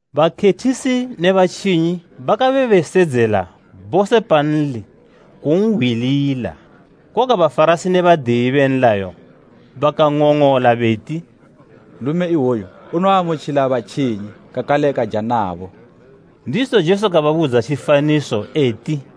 Bakhethisi ne batjinyi bakabe besedzela bose panli kun'hwilila. Koga Bafarasi ne badiyi be nlayo bakang'ong'ola beti, “Nlume iwoyu unoamutjila batjinyi, kakale kaja nabo.” Ndizo Jesu kababudza tjifaniso, eti: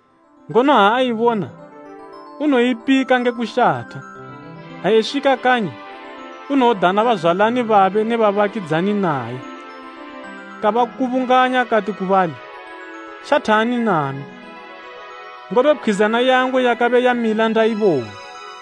Ngono ha aibona, unoipika nge kushatha. Ha eswika kanyi, unodana bazwalani babe ne babakidzani naye, kabakubunganya kati ku bali, ‘Shathani nami, ngobe pkhwizana yangu yakabe yamila ndaibona.’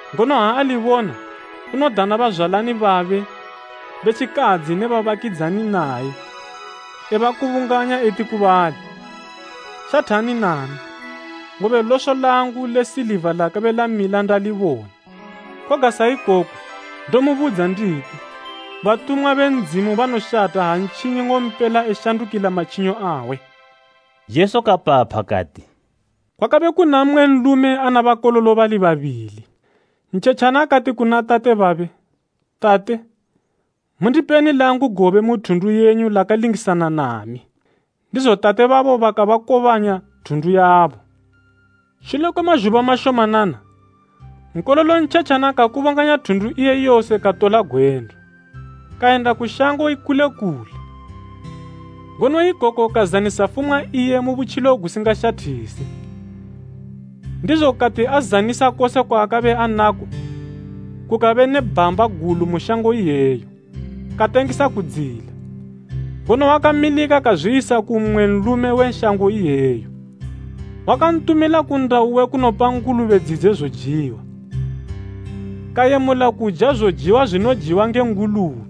Ngono ha alibona unodana bazwalani babe be tjikadzi ne babakidzani naye, ebakubunganya eti ku bali, ‘Shathani nami, ngobe loso langu le siliva lakabe lamila ndalibona.’ Koga sa ikoko, ndomubudza nditi, batumwa be Ndzimu banoshatha ha ntjinyi nng'ompela eshandukila matjinyo awe.” Jesu kapapha kati, “Kwakabe kuna mmwe nlume ana bakololo bali babili. Ntjetjana kati kuna tate babe, ‘Tate, mundipeni langu gobe mu thundu yenyu lakalingisana nami.’ Ndizo tate babo bakabakobanya thundu yabo. Shule kwe mazhuba mashomanana, nkololo ntjetjana kakubunganya thundu iye yose katola gwendo, kayenda ku shango ikule kule, ngono ikoko kazanisa fumwa iye mu butjilo gusingashathise. Ndizo kati azanisa kose kwaakabe anako, kukabe ne bhamba gulu mu shango iyeyo, katangisa kudziyila. Ngono wakamilika kazwiyisa ku mmwe nlume we shango iyeyo, wakantumila ku nnda uwe kunopa hwotji dzidze zojiwa. Kayemula kuja zojiwa zwinojiwa ne hwotji,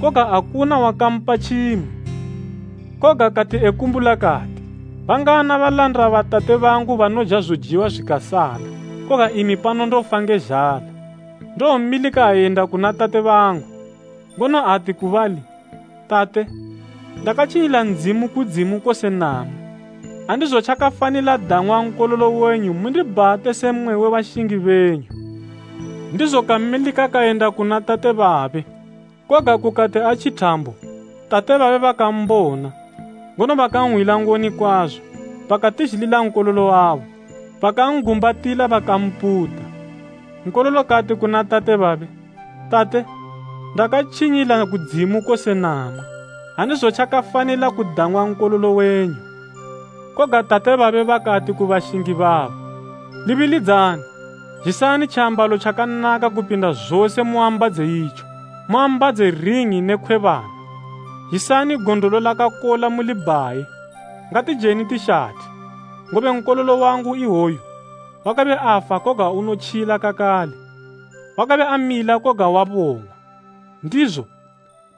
koga akuna wakampa tjimwe. Koga kati ekumbula kati, ‘Bangana balanda ba tate bangu banoja zojiwa zwikasala, koga imi pano ndofa nge zhala! Ndowomilika ayenda kuna tate bangu, ngono ati ku bali, Tate, ndakatjinyila kudzimu kose namwi. Andizotjafanila dang'wa nkololo wenyu mundibhate se mmwe we bashingi benyu.’ Ndizo kamilika kayenda kuna tate babe. “Koga kukati atji thambo, tate babe bakambona, ngono bakanhwila ngoni kwazo. Bakatizhilila nkololo wabo, bakan'gumbatila bakamputa. Nkololo kati kuna tate babe, ‘Tate, ndakatjinyila kudzimu kose namwi. Andizotjafanila kudang'wa nkololo wenyu.’ Koga tate babe bakati ku bashingi babo ‘Libilidzani! Zhisani tjiambalo tjakanaka kupinda zose mun'ambadze itjo. Mun'ambadze ring'i ne khwebana. Zhisani gondolo lakakola mulibhaye. Ngatijeni tishathe. Ngobe nkololo wangu iwoyu, wakabe afa koga unotjila kakale, wakabe amila koga wabong'wa.’ Ndizo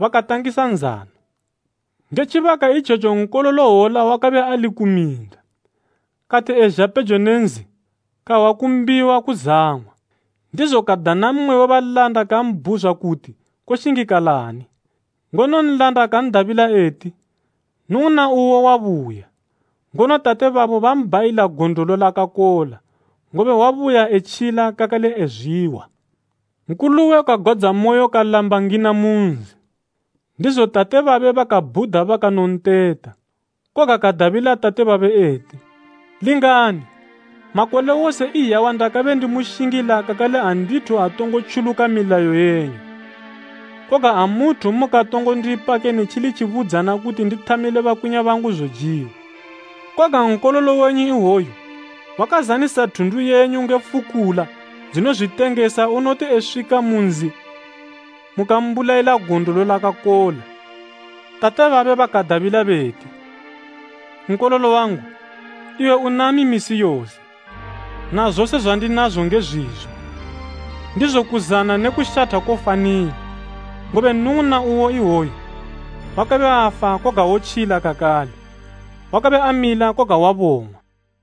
bakatangisa nzano. “Nge tjibaka itjetjo nkololo hwola wakabe ali ku minda. Kati ezha pejo ne nzi, kahwa kumbiwa kuzang'wa. Ndizo kadana mmwe we balanda kambhuzwa kuti koshingikalani. Ngono nlanda kan'dabila eti, ‘Nnung'una uwo wabuya, ngono tate babo mbhayila gondolo lakakola, ngobe wabuya etjila kakale ezwihwa.’ “Nkuluwe kagwadzamoyo kalamba ngina mu nzi, ndizo tate babe bakabhuda bakanonteta. Koga kadabila tate babe eti, ‘Lingani! Makole wose iyawa ndakabe ndimushingila kakale andithu atongo tjuluka milayo yenyu. Koga amuthu mukatongo ndipa kene tjili tjibudzana kuti ndithamile bakwinya bangu zojiwa. Koga nkololo wenyu iwoyu wakazanisa thundu yenyu nge fukula dzinozwitengesa unoti eswika mu nzi mukambulayila gondolo lakakola!’ Tate babe bakadabila beti, ‘Nkololo wangu, iwe unami misi yose, na zose zwandinazo nge zwizo. Ndizo kuzana ne kushatha kofanila, ngobe nnung'una uwo iwoyu, wakabe afa koga wotjila kakale, wakabe amila koga wabong'wa.’”